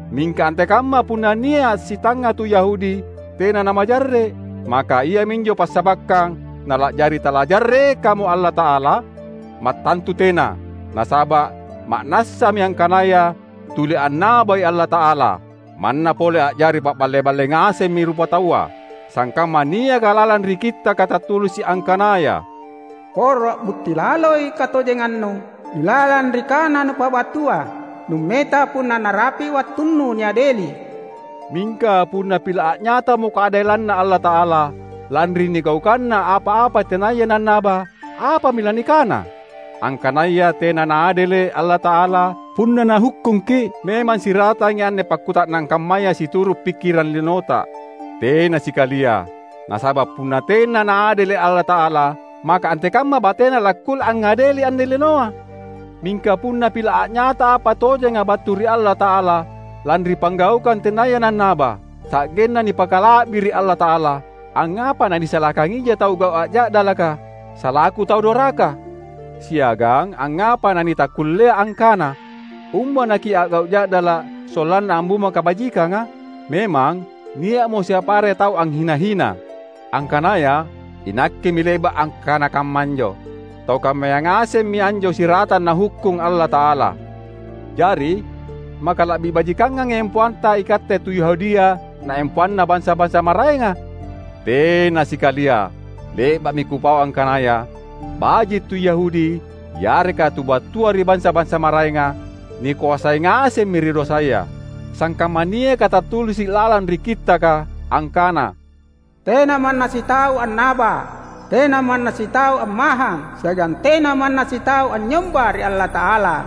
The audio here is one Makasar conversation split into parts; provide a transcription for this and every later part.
Mingka antekamma punna nia’ sitangnga tu Yahudi tena namajarre’? Maka iaminjo passabakkang nala’jari talajarrekamo Allata’ala? Mattantu tena! Nasaba’ ma’nassami angkanaya tuli annabai Allata’ala, manna pole a’jari paballe-balle ngasemmi rupataua. Sangkamma niaka lalang ri Kittaka tattulisi’ angkanaya, "Poro a’butti laloi katojengannu ilalang ri kana nupabattua, nummeta punna narapi’ wattunnu niadeli." Mingka punna pila’ a’nyatamo kaadelanNa Allata’ala, lanri nigaukanna apa-apa tenaya nannaba, apami lanikana? Angkanaya tena Naadele’ Allata’ala punna Nahukkungki’? (Memang siratangi anne pakkuta’nang kammaya situru’ pikkirang linota.) Tena sikalia! Nasaba’ punna tena Naadele’ Allata’ala, maka antekamma bateNa lakkulle angngadeli anne linoa? Mingka punna pila’ a’nyata apa tojenga battu ri Allata’ala lanri panggaukang tenaya nannaba, sa’genna nipakala’biri’ Allata’ala, angngapa nanisalakangija tau a’gau’ ja’dalaka, salaku tau doraka? Siagang angngapa nanitakkullea angkana, "Umba nakia’gau’ ja’dala’ sollanna ammumba kabajikanga?" Memang nia’mo siapa are tau anghina-hina’, angkanaya inakkemi le’ba’ akkana kamma anjo. Tau kammaya ngasemmi anjo siratang Nahukkung Allata’ala. Jari, maka la’bi bajikangangi empoanta ikatte tu Yahudia na empoanna bansa-bansa maraenga? Tena sikalia! Le’ba’mi kupau angkanaya, baji’ tu Yahudi yareka tu battua ri bansa-bansa maraenga, nikoasai ngasemmi ri dosaya. Sangkamma niaka tattulisi’ lalang ri Kittaka, angkana, "Tena manna sitau annaba, tena manna sitau ammahang siagang tena manna sitau anynyomba ri Allata’ala.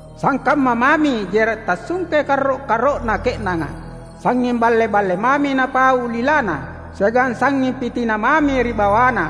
Sangkamma mami jera’ tassungke karro’-karro’na ke’nanga. Sangnging balle-balle mami napau lilana, siagang sangnging pitina mami ri bawana,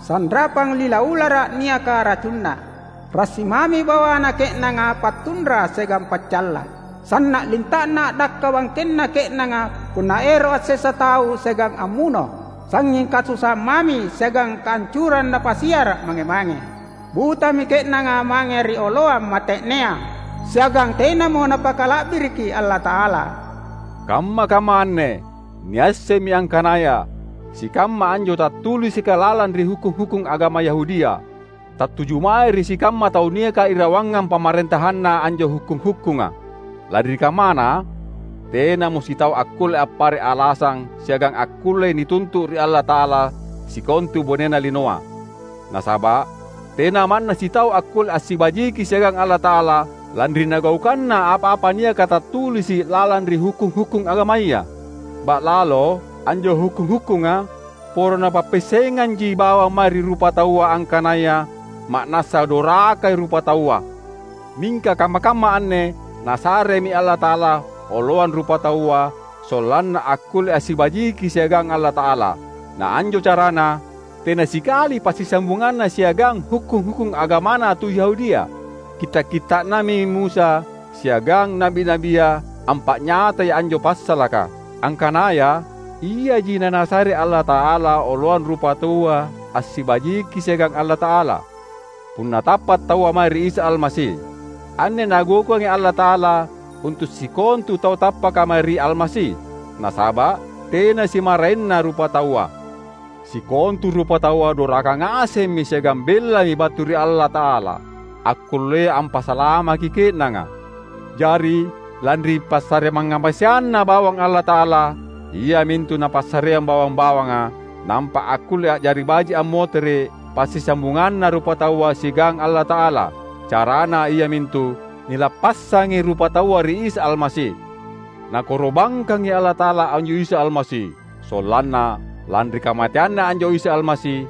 sanrapang lila ulara’ niaka racunna. Rassi mami bawana ke’nanga pattunra siagang paccalla. Sanna’ linta’na a’dakka bangkenna ke’nanga punna ero’ assessa tau siagang ammuno. Sangnging kasusaang mami siagang kaancurang napasiara’ mange-mange. Butami ke’nanga mange ri oloang mate’nea, siagang tenamo napakala’biriki Allata’ala." Kamma-kamma anne niassemmi angkanaya sikamma anjo tattulisika lalang ri hukkung-hukkung agama Yahudia, tattuju mae ri sikamma tau niaka irawangang pamarentahanna anjo hukkung-hukkunga. Lanri kammana, tenamo sitau akkulle appare’ alasang siagang akkullei nituntu’ ri Allata’ala sikontu bonena linoa. Nasaba’ tena manna sitau akkulle assibajiki siagang Allata’ala lanri nagaukanna apa-apa niaka tattulisi’ lalang ri hukkung-hukkung agamaya. Ba’lalo anjo hukkung-hukkunga poro napappiassenganji bawang mae ri rupataua angkanaya ma’nassa dorakai rupataua. Mingka kamma-kamma anne Nasaremi Allata’ala oloang rupataua sollanna akkulle assibajiki siagang Allata’ala; na anjo carana, tena sikali passisambunganna siagang hukkung-hukkung agamana tu Yahudia. Kitta’-kitta’nami Musa siagang na’bi-na’bia ampa’nyatai anjo passalaka; angkanaya, iaji naNasare Allata’ala oloang rupataua assibajiki siagang Allata’ala, punna tappa’ taua mae ri Isa Almasi. Anne Nagaukangi Allata’ala untu’ sikontu tau tappaka mae ri Almasi; nasaba’ tena simmaraenna rupataua: sikontu rupataua doraka ngasemmi siagang bellami battu ri Allata’ala, akkullea ampasalamaki ke’nanga. Jari, lanri passare mangngamaseanNa bawang Allata’ala, iamintu Napassareang bawang-bawanga, nampa akkulle a’jari baji’ ammotere’ passisambunganna rupataua siagang Allata’ala; carana iamintu: nilappassangi rupataua ri Isa Almasi. Nakoro’bangkangi Allata’ala anjo Isa Almasi; sollanna, lanri kamateanNa anjo Isa Almasi,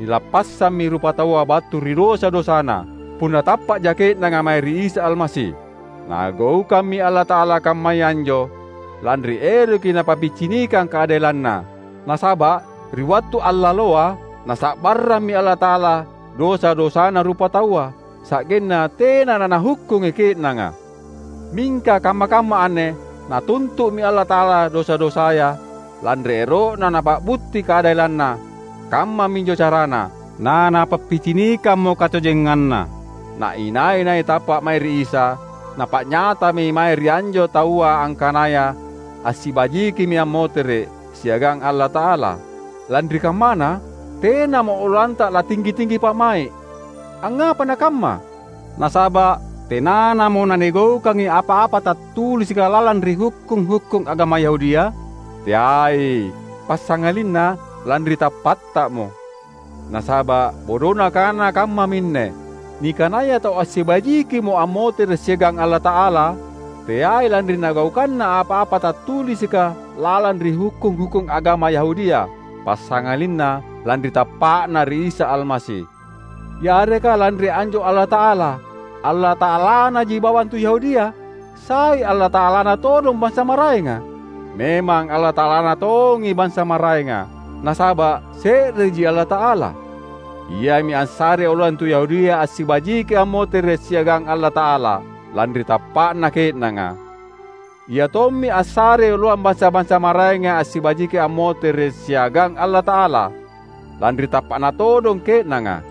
nilappassammi rupataua battu ri dosa-dosana, punna tappa’ja ke’nanga mae ri Isa Almasi. Nagaukammi Allata’ala kammaya anjo, lanri eroki Napappicinikang kaadelanNa. Nasaba’ ri wattu allaloa, Nasa’barrammi Allata’ala dosa-dosana rupataua, sa’genna tena naNahukkungi ke’nanga. Mingka kamma-kamma anne Natuntu’mi Allata’ala dosa-dosaya, lanri ero’na Napa’butti kaadelanNa. Kammaminjo carana, naNapappicinikammo katojenganNa; na inai-nai tappa’ mae ri Isa, Napa’nyatami mae ri anjo taua angkanaya assibajikimi ammotere’ siagang Allata’ala. Lanri kammana, tenamo oloanta latinggi-tinggi pa’mai’. Angngapa nakamma? Nasaba’ tenanamo nanigaukangi apa-apa tattulisika lalang ri hukkung-hukkung agama Yahudia? Teai! Passangalinna lanri tappattamo. Nasaba’ bodona kana kammaminne: Nikanaya tau assibajikimo ammotere’ siagang Allata’ala teai lanri nagaukanna apa-apa tattulisika lalang ri hukkung-hukkung agama Yahudia, passangalinna lanri tappa’na ri Isa Almasi. Yareka lanri anjo Allata’ala, Allata’alanaji bawang tu Yahudia? Sai Allata’alana todong bansa maraenga? Memang Allata’alana tongi bansa maraenga! Nasaba’ se’reji Allata’ala. Iami assarei oloang tu Yahudia assibajiki ammotere’ siagang Allata’ala, lanri tappa’na ke’nanga. Ia tommi assarei oloang bansa-bansa maraenga assibajiki ammotere’ siagang Allata’ala, lanri tappa’na todong ke’nanga.